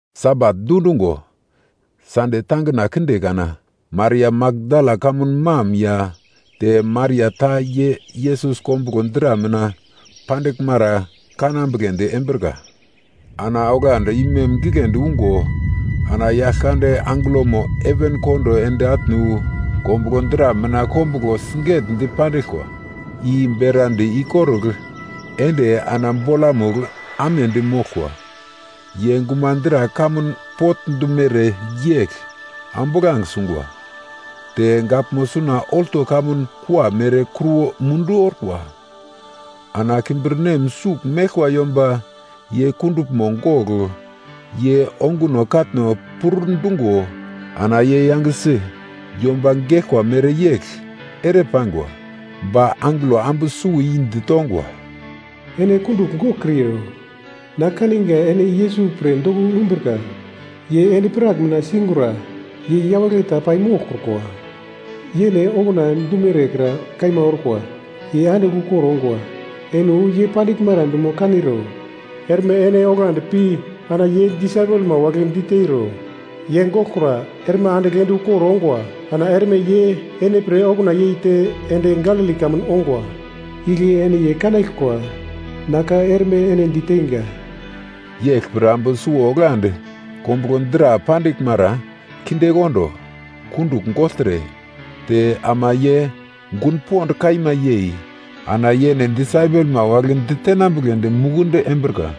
Sabat dundungo, Sande tangina kinde kana, Maria Makdala kamun mam ya te Maria ta ye Yesus kombuglo dra mina pandiglmara kanambugledi embrika. Ana oglandi imem giglendi ungo ana Yaglkande angelomo heven kondo ende atne wu, kombuglo dra mina kombuglo sigetdi pandiglkwa i berandi ikorugl ende ana bolamugl amedi moglkwa. Ye gumadra kamun potndumere yegl ambuglange sungwa. Te gaglmo suna olto kamun kua mere kruwo mundu orkwa. Ana kimbirnem sugl meglkwa yomba ye kunduglmo gogl ye onguno katno pur-dungo ana ye yangesi yomba geglkwa mereyegl ere paingwa. Ba angelo ambu suwo i ditongwa, “Ene kundugl goglkriro. Na kaninga ene Yesus pre doko umbrika, ye endi-prak mina singura. Ye yawagle ta pai moglkrukwa. Yene okuna dumere kra kaima orkwa. Ye andigl ukor ongwa. Ene wu ye pandiglmara dumo kaniro. Erme ene oglandi pi ana ye disaipelma wagle diteiro: ‘Ye goglkura, erme andigl ende ukor ongwa. Ana erme ye ene pre okuna yeite ende Galili kamun ongwa. Igle ene ye kanaglkwa.’ Na ka erme ene diteinga.” Yeglpre ambu suwo oglandi kombuglo dra pandiglmara kindekondo, kundugl gogltre, te ama ye gun pond kaima yei ana yene disaipelma wagle ditenambugledi mukundi embrika.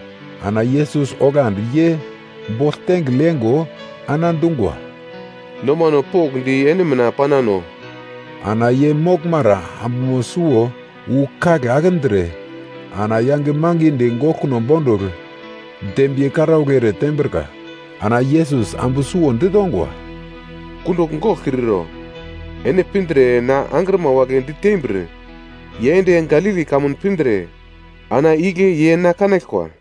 Ana Yesus oglandi ye bogl tengigl yengo ana dungwa, “Nomano pokndi ene mina panano.” Ana ye moglmara ambumo suwo wu kagle akindre ana yange mangidi goglkuno bondugl dembiye karaugl ere tembrika. Ana Yesus, ambu suwo ditongwa, “Kundugl goglkriro. Ene pindre na angrima wagle ditembir ye ende Galili kamun pindre ana igle ye na kanaglkwa.”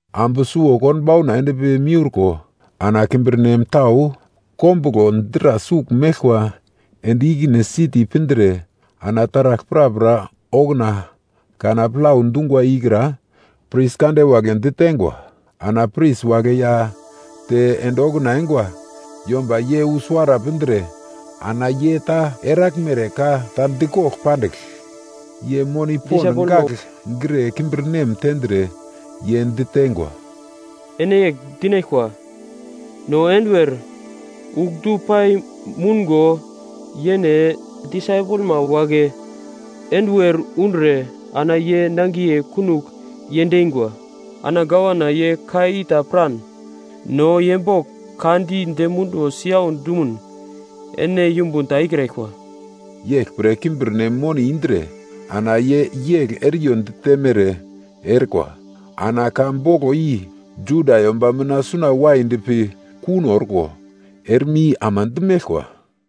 Ambu suwo konbauna endpi miurko ana kimbirnem tau kombuglo dra sugl meglkwa ende ikine siti pindre ana taragl prapra okuna kana plau dungwa ikra pris kande wagle diteingwa. Ana pris wagle ya te ende okuna eingwa yomba ye wu suwara pindre ana ye ta eraglmere ka ta dikogl pandigl, ye moni pond gagl gre kimbirnem tendre, ye diteingwa, “Ene yegl dinaglkwa, ‘No enduwer ugl du pai moungo yene disaipelma wagle enduwer undre ana ye nangiye kunogl yendeingwa.’ Ana gavana ye ka i ta piran, no ye bogl ka di dem munduwo siyau dumuno ene yumbun ta ikraglkwa.” Yeglpre kimbirnem moni indre ana ye yegl eriyo ditemere erikwa. Ana ka boglo i Juda yomba mina suna waidi pi kuno orko, erme i ama di meglkwa.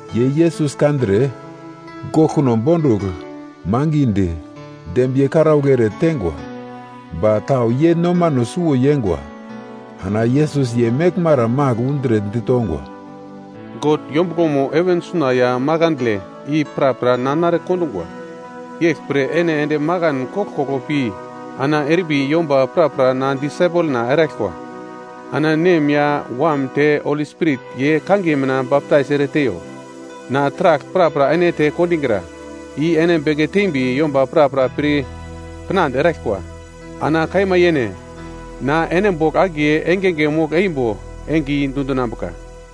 Ye Yesus kandre, goglkuno bondugl mangidi, dembiye karaugl ere teingwa. Ba tau ye nomano suwo yeingwa. Ana Yesus ye meglmara magl undre ditongwa, “God yombuglomo heven suna ya makandle i prapra na nare kondungwa. Yeglpre ene ende makan koglkoglo pi ana erimbi yomba prapra na disaipelna eraglkwa. Ana Nem ya Wam te Holi Spirit ye kangiye mina baptais ere teiyo. Na taragl prapra ene dite kondingra, i ene beke tembi yomba pir pinande eraglkwa. Ana kaima yene, na ene bogl akiye engenge mogl-eimbo enge i dundinambuka.”